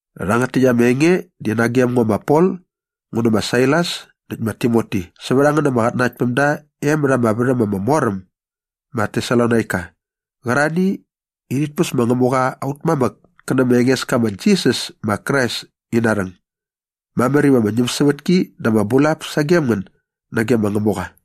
Rhangät täkt ama enge di nagem ngo ma Pol ngu nä ma Sailas näkt ma Timoti sävät a ngän ama qatnanaktpämda e mät ama värhäm ama mor äm ma Tesalonaika qärarhani i rhit päs ma Ngämuqa aut mamäk kä nä ma Engeska ma Jisas ma Krais ina rhäng. Mamär iva ama ñämsävätki dä ama bulap sagem ngän nage ma Ngämuqa.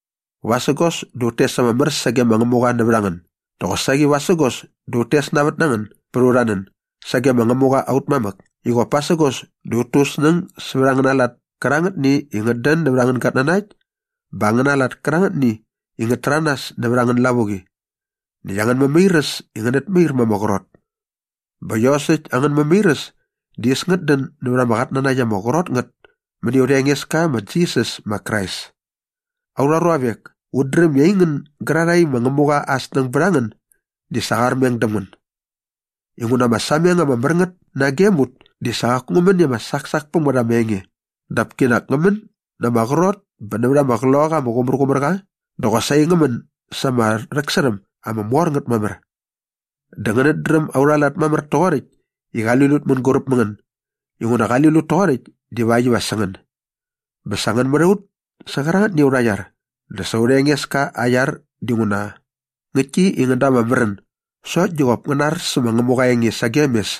Vasägos dä ut tes ama mär sage ma Ngämuqa nävät a ngän dä qosaqi vasägos dä ut tes navät na ngän bät aurha nän sage ma Ngämuqa aut mamäk i qop pasägos dä ut tu ut snäng sävät angäna lat kärangätni i ngät dän nävät angän gatnanakt bä angäna lat kärangätni i ngät täranas nävät angän lavuqi näkt angän mämairäs i ngänät mair ma ama qrot. Bä iosäkt angän mämairäs di äs ngät dän nävät ama qatnanakt ama qrot ngät mäni aurha Engeska ma Jisas ma Krais. Aurha ruavek, ut dräm i aingän gärarhae i ma Ngämuqa aa snäng bät a ngän di sa qa armeng däm ngän. Inguna ama sameng ama mär ngät nagem ut di sa qaku ngä män i ama saksak päm ngät ama enge dap kinak ngä män na ama qrot bä nävät ama Qloqaqa ama Qumärqumärqa dä qosaqi ngä män sa ama rhäksärhäm ama mor ngät mamär. Dä ngänät dräm aurha lat mamär toqoräkt i qali lut mänguräp mä ngän inguna qali lut toqoräkt divakt iva sä ngän. Bä sa ngän mät a ut sä qärangätni aurha iar dä sa aurha Engeska aa iar dinguna ngäktki i ngän da ama märän sokt di qop ngäna ar sä ma Ngämuqa aa enge sagem mes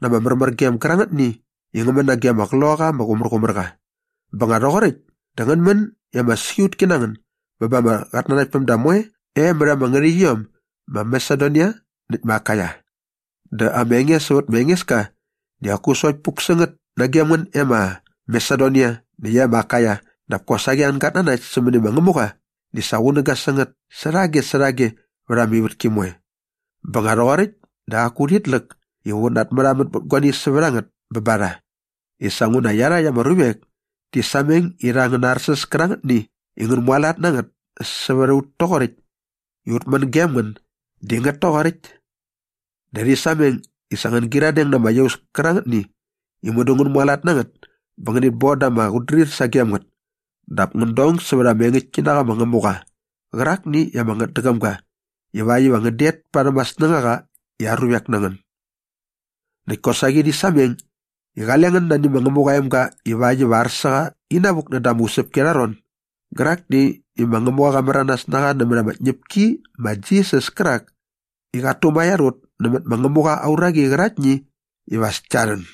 na ama märmärgem gärangätni i ngä män nage ama Qloqaqa ama Qumärqumärqa. Bä nga rhoqoräkt dä ngän män i ama siqutki na ngän bä ba ama qatnanaktpämda moe e mät ama ngärhäqyiom ma Masedonia näkt ma Akaia. Dä ama enge sävät ma Engeska di qaku sokt puk sä ngät nagem ngän e ma Masedonia näkt e ma Akaia dap kosaqi angän gatnanakt sämäni ma Ngämuqa di sa qunäga sä ngät särhage särhage vät ama ivätki moe. Bä nga rhoqoräkt dä qaku urhit läk iva ut namärhamän bät guani sävät a ngät bä ba rha i sa nguna iarhakt ama ruvek ti sameng irha ama arsäs kärangätni i ngän mualat na ngät sävät a ut toqoräkt i ut män gem ngän di ngät toqoräkt. Dä rhi sameng i sa ngän gyiradeng na ama iaus kärangätni i mudu ngän mualat na ngät bä ngänit bon da ama qutdrir sagem ngät dap ngän dong sävät ama engäktki na qa ma Ngämuqa qärakni i ama ngätdäqäm ga ivakt iva ngän det parhäm aa snängaqa i aa ruvek na ngän. Näkt kosaqi rhi sameng i qale ngän nani ma Ngämuqa aa emga ivakt iva ar sä qa inavuk näda ama usäpki arha ron gärakni i ma Ngämuqa qa märanas na qa nämät ama tñäpki ma Jisas kärak i qat tumaiar ut nämät ma Ngämuqa aa uraqi qäraktni iva as kia rhän.